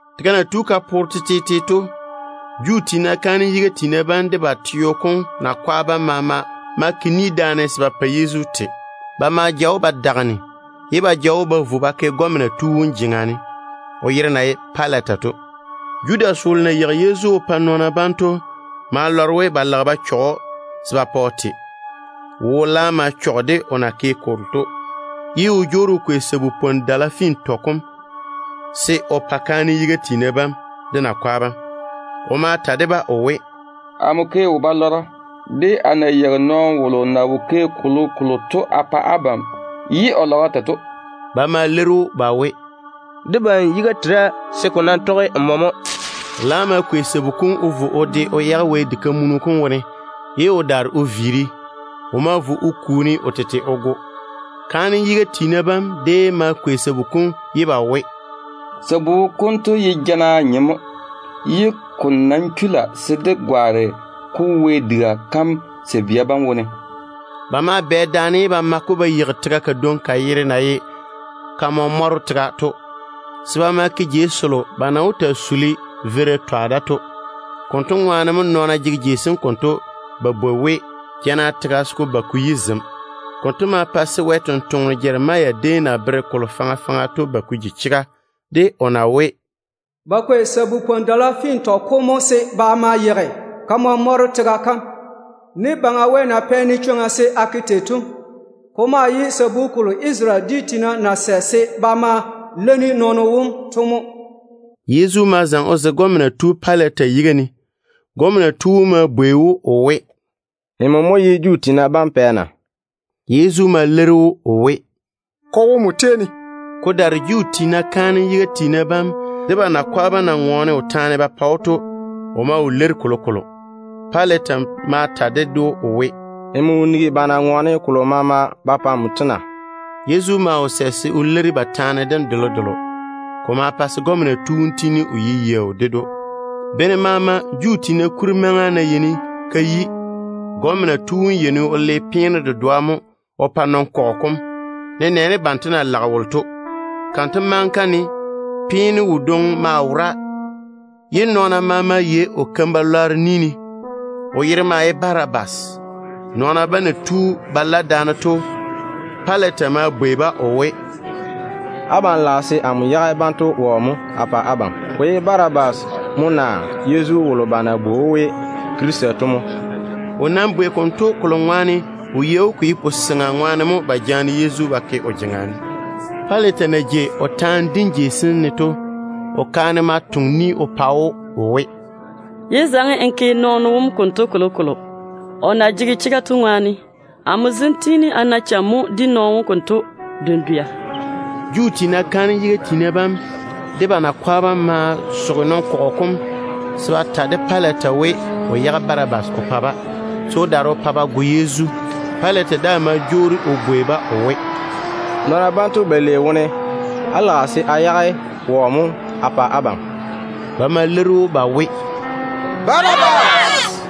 Tega na tu ka poore tetete to, Juu tiina kaanem yiga tiina bam de ba teo kom nakwa bam maama ma ke ni daane se ba pa Yezu te. Ba ma ja‑o ba vɔ, ye ba ja‑o ba vo ba ke gɔmena tu wom jeŋa ne, o yere na ye Pilata to. Judas wolo na yeigi Yezu o pa nɔɔna bam to ma lɔre we ba di o taane se ba pa o to mo. O wo laam ma chɔge de o na ke kolo to, ye o jwoori o kwei lu-nyenno sabu-dala fintɔ kom se o pa kaanem yiga tiina bam de ba nakwa bam. O ma ta de-ba o we, “Amo ke a tusi, de a na yeigi nɔɔno wolo na wo ke kolokolo to a pa abam, ye á lage á go‑o to.” Ba ma leiri‑o ba we, “Debam yiga tera, se ko nam tɔge nmo mo.” O laam ma kwei sabu kom o ja vo o de o yage Wɛ diga kam wone, ye o daare o viiri. O ma vo o kuuri o tete o go. Kaanem yiga tiina bam déem ma kwei sabu-dala yam ye ba we, “Sabu konto ye jana nyem mo. Ko nam chula se dé gwaane-ko Wɛ diga sabia bam wone.” Ba ma bwɛ daane ye ba ma-ko ba yeigi tega kadwoŋi ka yere na ye ‘Kamɔ-mɔro tega’ to, se ba ma ke veira yibeela jeiga. Konto ŋwaane mo nɔɔna jege jeiga kam konto ba bwoi we ‘Jana tega’ se ko ba ko yi zem. Konto ma pa se Wɛ sampwora Jeremia déem na bere kolo faŋa faŋa to ba ko ji chega de o na we, “Ba kwei lu-nyenno sabu-dala fintɔ kom mo ba ma yeigi kamɔ-mɔro tega kam, ne Baŋa Wɛ na pɛ-ne ni se a ke tei to. Ko maa ye sabu kolo Isarele dwi tiina na sɛ se ba ma leini nɔɔno wom to mo.” Yezu ma zaŋe o zege gɔmena tu Pilata yiga ne. Gɔmena tu wom ma bwei‑o o we, “Nmo mo ye Juu tiina bam pɛ na?” Yezu ma leiri‑o o we, “Ko wo nmo tei ne.” Ko daare Juu tiina kaanem yiga tiina bam de ba nakwa bam na ŋɔɔne o taane ba pa‑o to, o wo leiri kolokolo. Pilata ma ta ded‑o o we, “Nmo wo nigi ba na ŋɔɔne kolo maama ba pa nmo to na?” Yezu maa wo sɛ se o leiri ba taane dem delodelo. Ko ma pa se gɔmena tu wom tiini o ye yaau ded‑o. Bene maama Juu tiina kuri maŋa ná yeini ka yi, gɔmena tu wom yeini o le peeno dedoa mo o pa nɔn-kɔgɔ kom, nenɛɛne banto na lage wolo to. Kanto maŋa kam ne peeno wodwoŋi maa wora, ye nɔɔna maama yei o keim-balwaaro ni ne. O yere mo Barabas. Nɔɔna bam na tu ba la daane to, Pilata ma bwei-ba o we, “Abam lage se amo yage banto wɔ mo a pa abam? Ko ye Barabas mo naa Yezu wolo ba na bwoi‑o we Krista to mo?” O bwei konto kolo ŋwaane o yei we ko ye wo-goo ŋwaane mo ba jaane Yezu ba ke o jeŋa ne. Pilata na jei o taane dim jei sem ne to, o kaane ma toŋe ni o pa‑o o we, “Yé zaŋe n ke nɔɔno wom konto kolokolo, o na jege chega to ŋwaane. Tete dento ne amo tiini a na yaara dedɛ dendwɛ wone nɔɔno wom konto ŋwaane.” Juu tiina kaanem yiga tiina bam de ba nakwa bam ma soge nɔn-kɔgɔ kom se ba ta de Pilata we, o yage Barabas o pa-ba, se o daare o pa ba go Yezu. Pilata daa ma jwoori o bwei-ba o we, “Nɔɔna banto balei wone abam lage se a yage wɔ mo a pa abam?” Ba ma leiri‑o ba we, “Barabas.”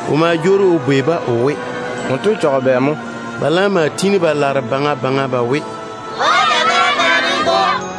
O ma jwoori o bwei-ba o we, “Wonto chɔge bɛ mo?” Ba laam ma tiini ba laare baŋa baŋa ba we, “Pa‑o dagara yuu ne n go.”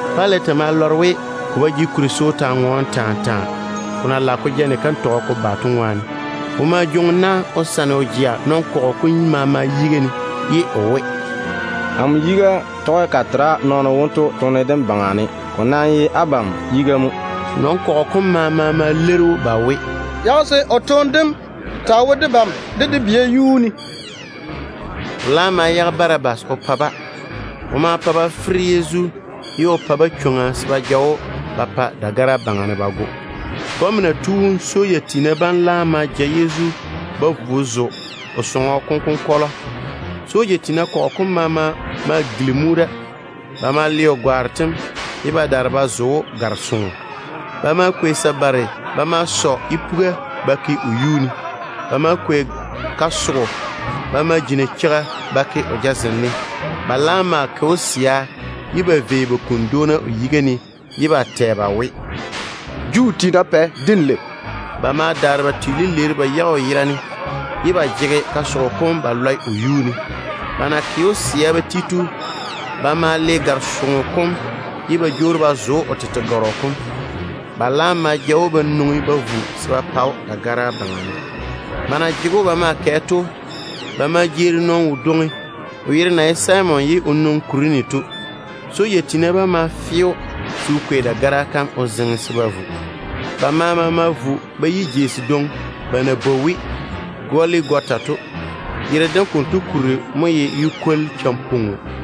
Pilata ma lɔre we ko ba jege kuri se o taa ŋɔɔne taa taa, ko na lage ko ja bobɔga ko ba to ŋwaane. O ma jwoŋi na o sane o jea nɔn-kɔgɔ kom maama yiga ne, ye o we, “Amo yiga tɔge ka tera nɔɔno wonto toone dem wone. Ko ye abam yiga mo.” Nɔn-kɔgɔ kom maama ma leiri‑o ba we, “Yage se o toone dem taa wo debam de dé bia yuu ne.” O laam ma yage Barabas o pa-ba. O ma pa ba fere Yezu, ye o pa-ba chwoŋa se ba ja‑o ba vo ba pa dagara yuu ne ba go. Gɔmena tu wom soja tiina bam laam ma ja Yezu ba vo ba zo o sɔŋɔ kom konkɔlɔ. Soja tiina kɔgɔ kom maama ma gilimi‑o da. Ba ma le o gwaaro tem, ye ba daare ba zo‑o gare-soŋo. Ba ma kwei sabare ba ma sɔ yipuga ba pu o yuu ne. Ba ma kwei kasogo ba ma ji nacheiga ba ke o jazem ne. Ba laam ma ke‑o kachaare ye ba vei ba kuni dwoona o yiga ne ba tɛ ba we, “Juu tiina pɛ, denlei naa!” Ba ma daare ba twe lileeru ba yage o yera ne, ye ba jege kasogo kom ba lɔe o yuu ne. Ba na ke‑o ba mɔne ba ti to, ba ma le gare-soŋo kom ye ba jwoori ba zo‑o o tete gɔrɔ kom. Ba laam ma ja‑o ba nwoŋi ba vo se ba pa‑o dagara yuu ne. Ba na jege‑o ba maa kɛ to, ba ma jeeri nɔɔno wodwoŋi, o yere na ye Simon ye o nwoŋi Kurene to. Soja tiina bam ma fe‑o se o kwei dagara kam o zeŋe se ba vo. Ba maama ma vo ba yi jeiga kadwoŋi ba na bwoi we ‘Goligota’ to. Yere dem konto kuri mo ye ‘Yu-kwoli-champoa Peo’.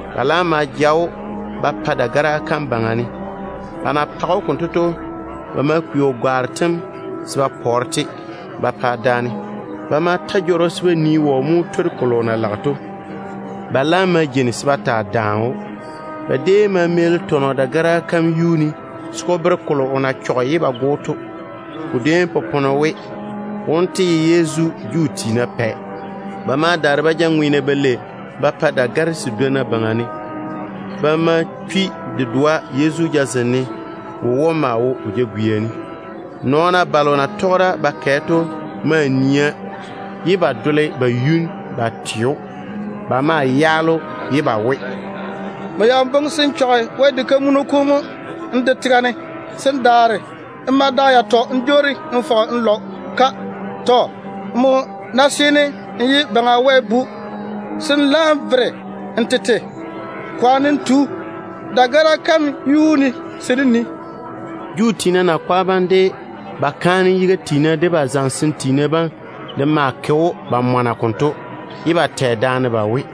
Ba laam ma ja‑o ba pa dagara kam yuu ne. Ba na page‑o konto to, ba ma kwei o gwaaro tem se ba pɔɔre-te ba pa daane. Ba ma ta jɔrɔ se ba nii wɔ mo wó twori kolo o na lage to. Ba laam ma jeini se ba taa daane‑o. Ba déem ma meeli tɔnɔ dagara kam yuu ne se ko bere kolo o na ke o chɔge ye ba go‑o to. Ko déem popone we: WONTO YE YEZU, JUU TIINA PƐ MO. Ba ma daare ba ja ŋweena balei ba pa dagare sedwonna baŋa ne. Ba ma chwi dedoa Yezu jazem ne. Wowom maa wo o jagwia ne. Nɔɔna balo na tɔge da ba kɛ to maa nia ye ba gɔgese ba yuni ye ba twe‑o. Ba maa yaale‑o, ye ba we, “Nmo ya boŋe se n yigi Wɛ diga kam mo n de tega ne, se n daare n ma da yatɔ n jwoori n fɔge n lɔ-ka. Tɔ. Nmo ná seene n ye Baŋa Wɛ Bu, se n laam vere n tete. Kwaane n tu da dagara kam yuu ne se dé nii.” Juu tiina nakwa bam, de ba kaanem yiga tiina, de ba zamesem tiina bam de maa ke‑o ba mɔna konto, ye ba tɛ daane ba we,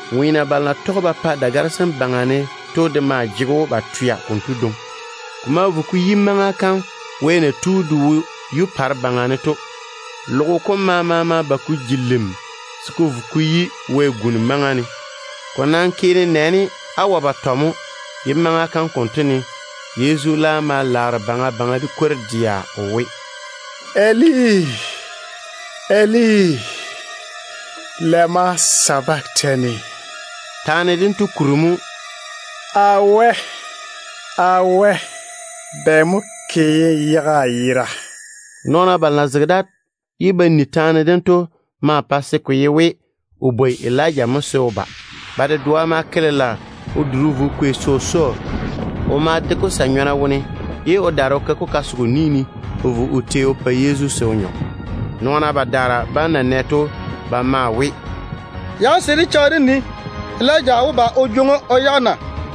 Ŋweena balo na tɔge ba pa dagare sem baŋa ne to de maa jege‑o ba twea konto dwoŋi. Ko ma vo ko yi maŋa kam wɛ na tu de wo yupare baŋa ne to. Tega kam maama ma ba ka ji lim se ko vo ko yi wɛ-guni maŋa ne. Ko na yi nenɛɛne luu batɔ to mo Yezu laare baŋa baŋa de kwor-dɛa o we, “Eli, Eli, lema sabaktani?” Taane dento kuri mo, “Amo Wɛ, amo Wɛ, bɛ mo ke ye n yage a yera?” Nɔɔna balo na zege da ye ba ni taane dem to badwonna ma boŋe we, o bwoi Elija mo se o ba. Ba dedoa ma ke lela o duri o vo o kwei sɔsɔɔ. O ma de-ko sa-nyɔna wone, ye o daare o ke-ko kasogo ni ne o vo o tei o pa Yezu se o nyɔ. Nɔɔna badaara bam na nɛ konto to, ba maa we, “Yage se dé cheigi dé nii, Elija wó ba o jwoŋi‑o o yage na.”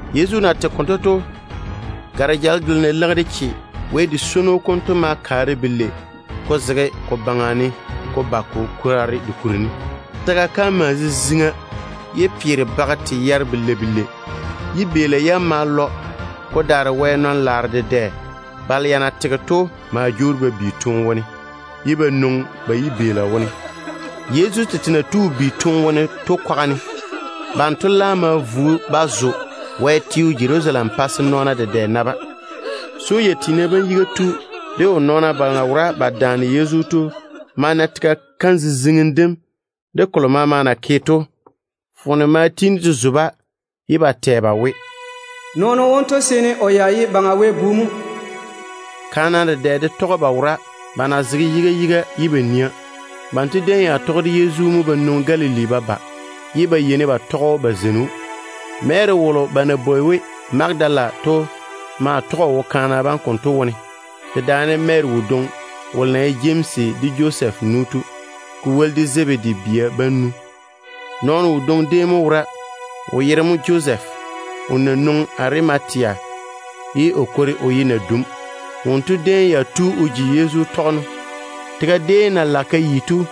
Yezu na tege konto to, gare-jale delo na leigi de che Wɛ di-yun-gala kam to ma kaare belei, ko zege ko baŋa ne ko tu ko kwaare ko kuri ne. Tega kam maa ziziŋa ye pelwaaro bage te yare. Yibeela yam ma puri. Ko daare Wɛ tete nɔɔna balo ya na tege to dedɛ ma jwoori ba bi, ye ba nwoŋi ba yibeela yam wone. Yezu tete na tu o bi toone wone to kwaga ne, banto laam ma vo ba zo Wɛ teo Jerusalem pa se nɔɔna dedɛ na-ba. Soja tiina bam yiga tu de o nɔɔna balo na wora ba yere Yezu to ma na tega kam ziziŋim dem de kolo maama na ke to. Foone ma tiini de zo-ba, ye ba tɛ ba we, “Nɔɔno wonto ya seene o ye Baŋa Wɛ Bu mo.” Kaana dedɛ de déem tɔge ba wora, ba na zege yiga yiga ye ba nia. Banto déem ya tɔge de Yezu mo ba nwoŋi Galili ba ba, ye ba yeini ba tɔge ba zeini‑o. Mary wolo ba na bwoi we Magadala to maa tɔge o wo kaana bam konto wone, dedaane Mary wodwoŋi wolo na ye Jemsi de Josɛf nu to, ko woli de Zebedi bia bam nu. Nɔɔno wodwoŋi déem mo wora, o yere mo Josef, o na nwoŋi Arimatea ye o kwori o ye nadum. Wonto de déem ya tu o ji Yezu tɔgeno. Tega déem na lage ka yi to,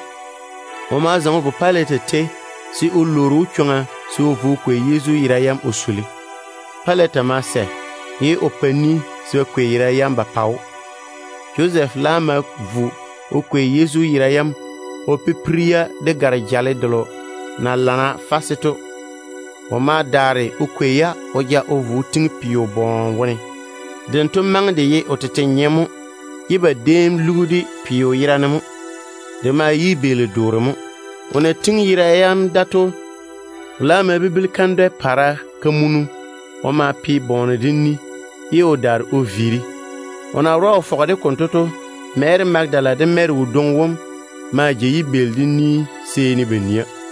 o ma zaŋe o vo Pilata tei se o lwoori‑o chwoŋa se o vo o kwei Yezu yera yam o suli. Pilata ma sɛ, ye o pa ni se ba kwei yera yam ba pa‑o. Josɛf laam ma vo o kwei Yezu yera yam o pipiri-ya de gare-jale delo na lamma to. O ma daare o kwei-ya o ja vo o tiŋi peo bɔɔne wone. Dento maŋe de ye o tete nyem mo, ye ba déem lugi-de peo yera ne mo. De ye yibeeli-doore mo. O na tiŋi yera yam da to, o laam ma bibili kandwɛ-polɔgɔ kamunu o ma pe bɔɔne dem ni, ye o daare o viiri. O na wora o fɔge-de konto to, Mary Magadala de Mary wodwoŋi wom maa jei yibeeli dem ni seeni ba nia.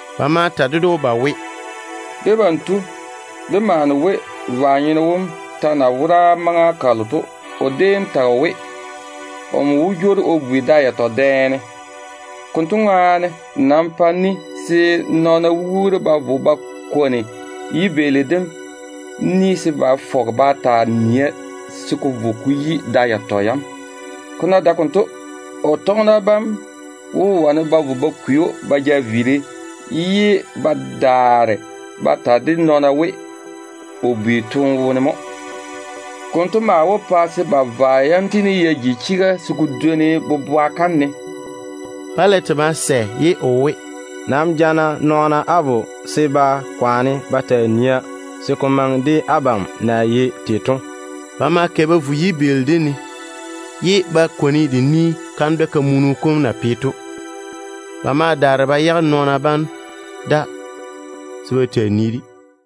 Ba ma ta ded‑o ba we, “Debam tu, dé maane we, vwa-nyeno wom ta na wora maŋa kalo to, o déem tage o we, omo wó jwoori o bi da yatɔ dɛ ne. Konto ŋwaane, nam pa ni se nɔɔna wuuri ba vo ba kwoni yibeeli dem ni se ba fɔge ba taa nia se ko vo ko yi da yatɔ dɛ dem. Ko ná dae konto, o tɔgena bam wó wane ba vo ba kwei‑o ba ja viiri, ye ba daare ba ta de nɔɔna we, o bi toone wone mo. Konto maa wó pa se ba vwa yam tiini ya ji chega se ko dwoni boboa kam ne.” Pilata ma sɛ ye o we, “Nam ja-na nɔɔna á vo se ba kwaane ba taa nia se ko maŋe de abam na yei tei to.” Ba ma kɛ ba vo yibeeli dem ne, ye ba kwoni de ni kandwɛ-kamunu kom na pe to. Ba ma daare ba yage nɔɔna bam da se ba taa yere-de.